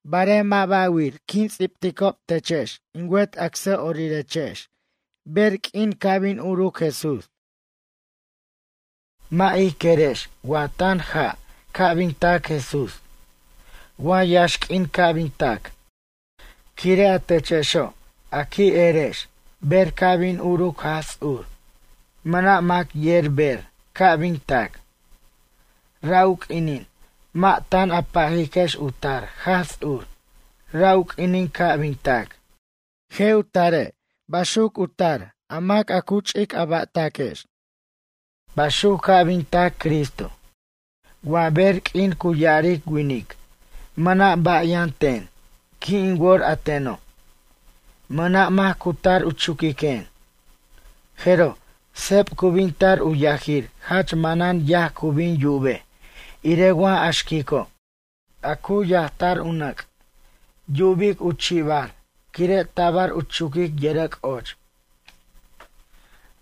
Barej mʌ' ba' wir quin ts'ibticob techex in wet acsʌ'orirechex ber q'uin ca' bin uruc Jesús. Mʌ' ij querex wa tan ja' ca' bin tac Jesús. Wa yaxq'uin ca' bin tac. Quire' a techexo' a qui' erex ber ca' bin uruc Jaj Ts'ur mʌna' mac yer ber ca' bin tac. Ra' u q'uinin mʌ' tan a pajiquex u tar Jaj Ts'ur ra' u q'uinin ca' bin tac. Je' u tare' baxuc u tar a mac a ch'a' a ba'taquex. Baxuc ca' bin tac Cristo. Wa ber q'uin cu ya'aric winic: mʌna' ba' yʌn ten, qui' in wor a teno'. Mʌna' mac cu tar u chuquiquen. Jeroj, seb cu bin tar u yajir jach manan yaj cu bin yubej irej wa a xquico'. A cu yajtar u nʌc', yubic u chi'ibar quire' tabar u chuquic yʌrʌc' och.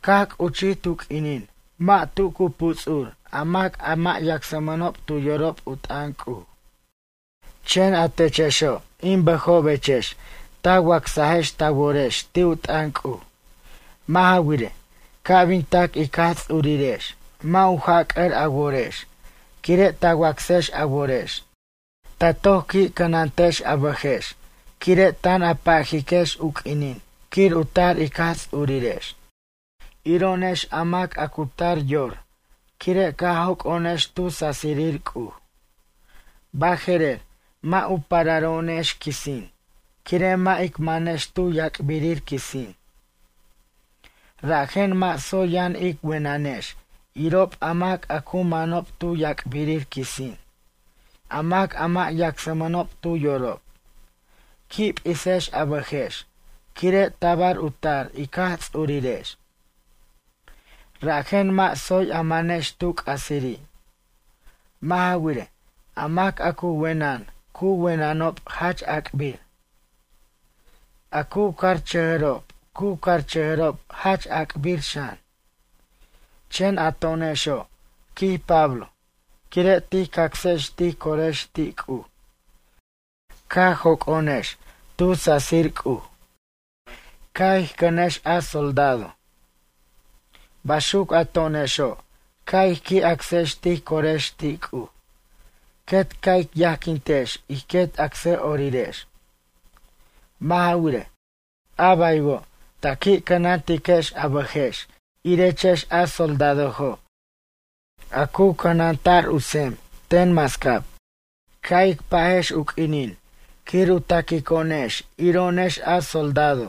Caj c'uchij tu q'uinin mʌ' tu cu puts'ur a mac a mʌ' yacsmʌnob tu yorob u t'ʌn C'uj. Chen atechexo', in bʌjobechex ta wacsechex ta worex ti' u t'ʌn C'uj. Mʌ' ja wirej, ca' bin tac ic Jaj Ts'urirex mʌ' u jac'ʌr a worex quire' ta wacsex a worex. Ta toc qui' cʌnantechex a bʌjex quire' tan a pajiquex u q'uinin quir u tar ic Jaj Ts'urirex. Iro'onex a mac a cu tar yor quire' caj joc'o'onex tu sasirir C'uj. Baje'rer mʌ' u pararo'onex quisin quire' mʌ' ic manex tu yac'birir quisin. Rajen mʌ' tsoy yʌn ic wenʌnex irob a mac a cu manob tu yac'birir quisin a mac a mʌ' yacsmʌnob tu yorob. Qui' p'isex a bʌjex quire' tabar u tar ic Jaj Ts'urirex. Rajen mʌ' tsoy a manex tu c'asiri'. Mʌ' ja wirej, a mac a cu wenʌn cu wenʌnob jach ac'bir. A cu carchʌjʌrob cu carchʌjʌrob jach ac'bir xan. Chen a to'onexo', quij Pablo, quire' tij cacsex tij corex ti' C'uj caj joc'o'onex tu sasir C'uj. Ca' ij cʌnex a soldado. Baxuc a to'onexo' ca' ij qui' acsex tij corex ti' C'uj, quet ca' ij yajquintex ij quet acsʌ'orirex. Mʌ' ja wirej, a baywo' ta qui' cʌnantiquechex a bʌjex irechex a soldadojo' a cu cʌnanta'r u tsem ten mascab. Ca' ic pajex u q'uinin quir u ta'quico'onex iro'onex a soldado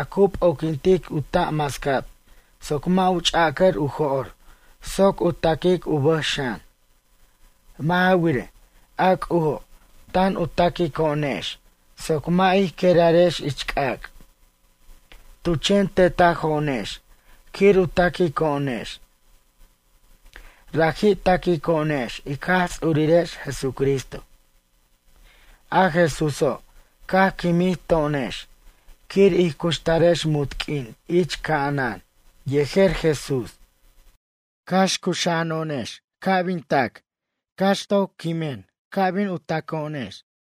a cu p'oquintic u ta' mascab soc mʌ' u ch'acʌr u jo'r soc u ta'quic u bʌj xan. Mʌ' ja wirej, a C'ujo' tan u ta'quico'onex soc mʌ' ij querarex ich c'ac'. Tu chen tetajo'onex quir u ta'quico'onex. Raji' ta'quico'onex ic Jaj Ts'urirex, Jesucristo. A Jesúso' caj quimij to'onex quir ij cuxtarex munt q'uin ich ca'anan yejer Jesús. Cax cuxa'ano'onex ca' bin tac cax toc quimen ca' bin taco'onex.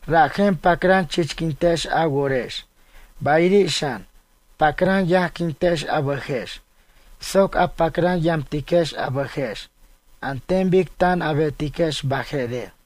Rajen pacran chichquintex a worex bayiri' xan pacran yajquintex a bʌjex soc a pacran yamtiquex a bʌjex an ten bic tan a betiquex baje'rer.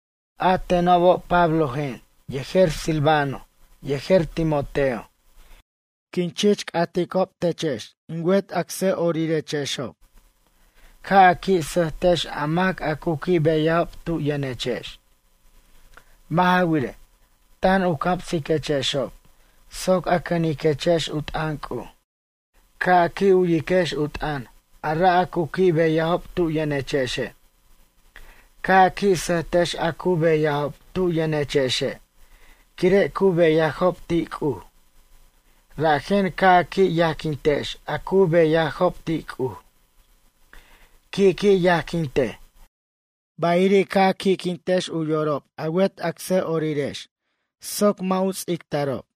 A tenob Pablojen yejer Silvano yejer Timoteo, quin chich c'aticob techex in wet acsʌ'orirexob ca' a qui' sʌjtex a mac a cu qui' beyajob tu yʌnechex. Mʌ' ja wirej, tan u camsiquechexob soc a cʌniquechex u t'ʌn C'uj. Ca' a qui' u'yiquechex u t'ʌn ara' a cu qui' beyajob tu yʌnechexe'. Ca' a qui' sʌjtex a cu beyajob tu yʌnechexe' quire' cu beyajob ti' C'uj. Rajen ca' a qui' yajquintex a cu beyajob ti' C'uj. Qui' qui' yajquintej. Bayiri' ca' a qui'quintex u yorob a wet acsʌ'orirex soc mʌ' u ts'ictarob.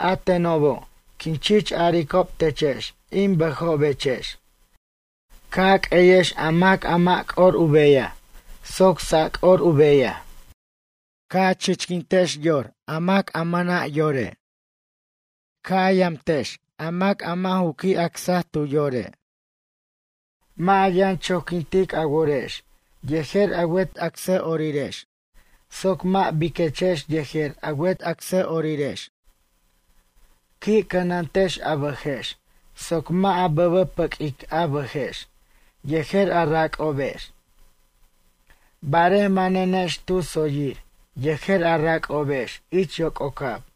A tenobo' quin chich aricob techex in bʌjobechex, ca' a q'ueyex a mac a mʌ' c'or u beyaj, soc sac'or u bayaj. Ca' a chichquintiquex yor a mac a mʌna' yore'. Ca' a yamtex a mac mʌ' ju qui' acsa tu yore'. Mʌ' a yʌn choquintic a worex yejer a wet acsʌ'orirex soc mʌ' biquechex yejer a wet acsʌ'orirex. Qui' cʌnantex a bʌjex soc mʌ' a bʌbʌpʌquic a bʌjex yejer a rac'obex. Barej manenex tu tsoyir yejer a rac'obex ich yoc'ocab.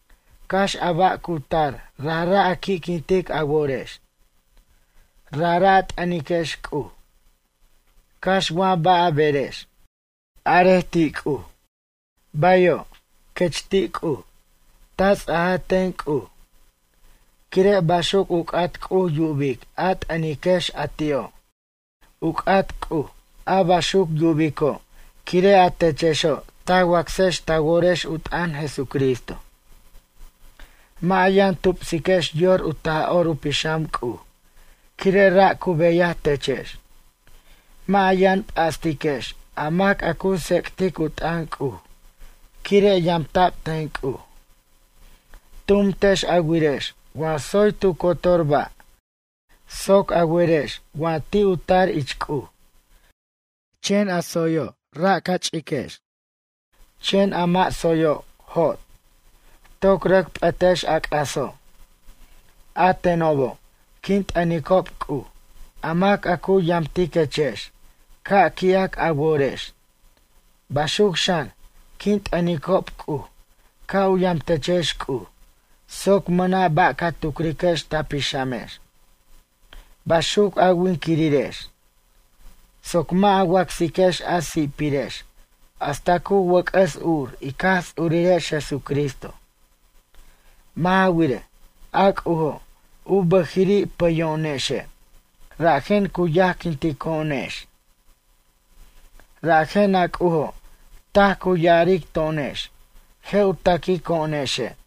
Cax a ba' cu tar rajra' a qui'quintic a worex. Rajra' a t'ʌniquex C'uj. Cax wa ba' a berex. Arej ti' C'uj: “Bayo'”, quex ti' C'uj, ta ts'aj ten C'uj. Quire' baxuc u c'at C'uj yubic a t'ʌniquex a ti'o'. U c'at C'uj a baxuc yubico' quire' a techexo' ta wacsex ta worex u t'ʌn Jesucristo. Mʌ' a yʌn tupsiquex yor u Taj'or u Pixam C'uj quire' ra' cu beyaj techex. Mʌ' a yʌn p'astiquex a mac a cu tsec'tic u t'ʌn C'uj quire' yamta'b ten C'uj. Tumtex a wirex wa tsoy tu cotor ba' soc a werex wa ti' u tar ich C'uj. Chen a tsoyo' ra' ca ch'iquechex, chen a mʌ' tsoyo', jot. Toc rʌc p'ʌtex a c'aso'. A tenobo', quin t'ʌnicob C'uj a mac a cu yamtiquechex ca' qui'ac a worex. Baxuc xan, quin t'ʌnicob C'uj ca' u yamtechex C'uj soc mʌna' ba' ca tucriquex ta pixamex. Baxuc a winquirirex, soc mʌ' a wacsiquex a si'pirex hasta cu wʌc'ʌs ur ic Jaj Ts'urirex Jesucristo. Mʌ' ja wirej, a C'ujo' u bʌjiri' pʌyo'onexe', rajen cu yajquintico'onex. Rajen a C'ujo' taj cu ya'aric to'onex: Je' u ta'quico'onexe'.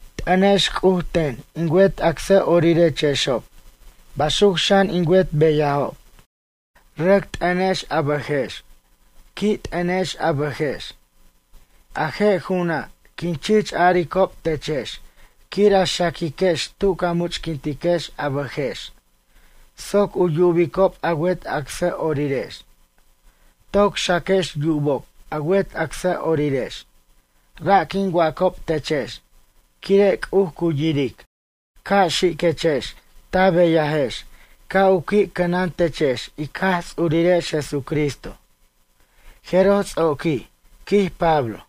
T'ʌnex C'uj ten in wet acsʌ'orirechexob baxuc xan in wet beyajob. Rʌc t'ʌnex a bʌjex. Qui' t'ʌnex a bʌjex. A je' ju'una' quin chich aricob techex quir a xaquiquex tu ca much'quintiquex a bʌjex soc u yubicob a wet acsʌ'orirex. Toc xaquex yubob a wet acsʌ'orirex. Ra' quin wacob techex quire' C'uj cu yiric. Ca' xiquechex ta beyajex ca' u qui' cʌnan techex ic Jaj Ts'urirex Jesucristo. Jeroj ts'oquij, quij Pablo.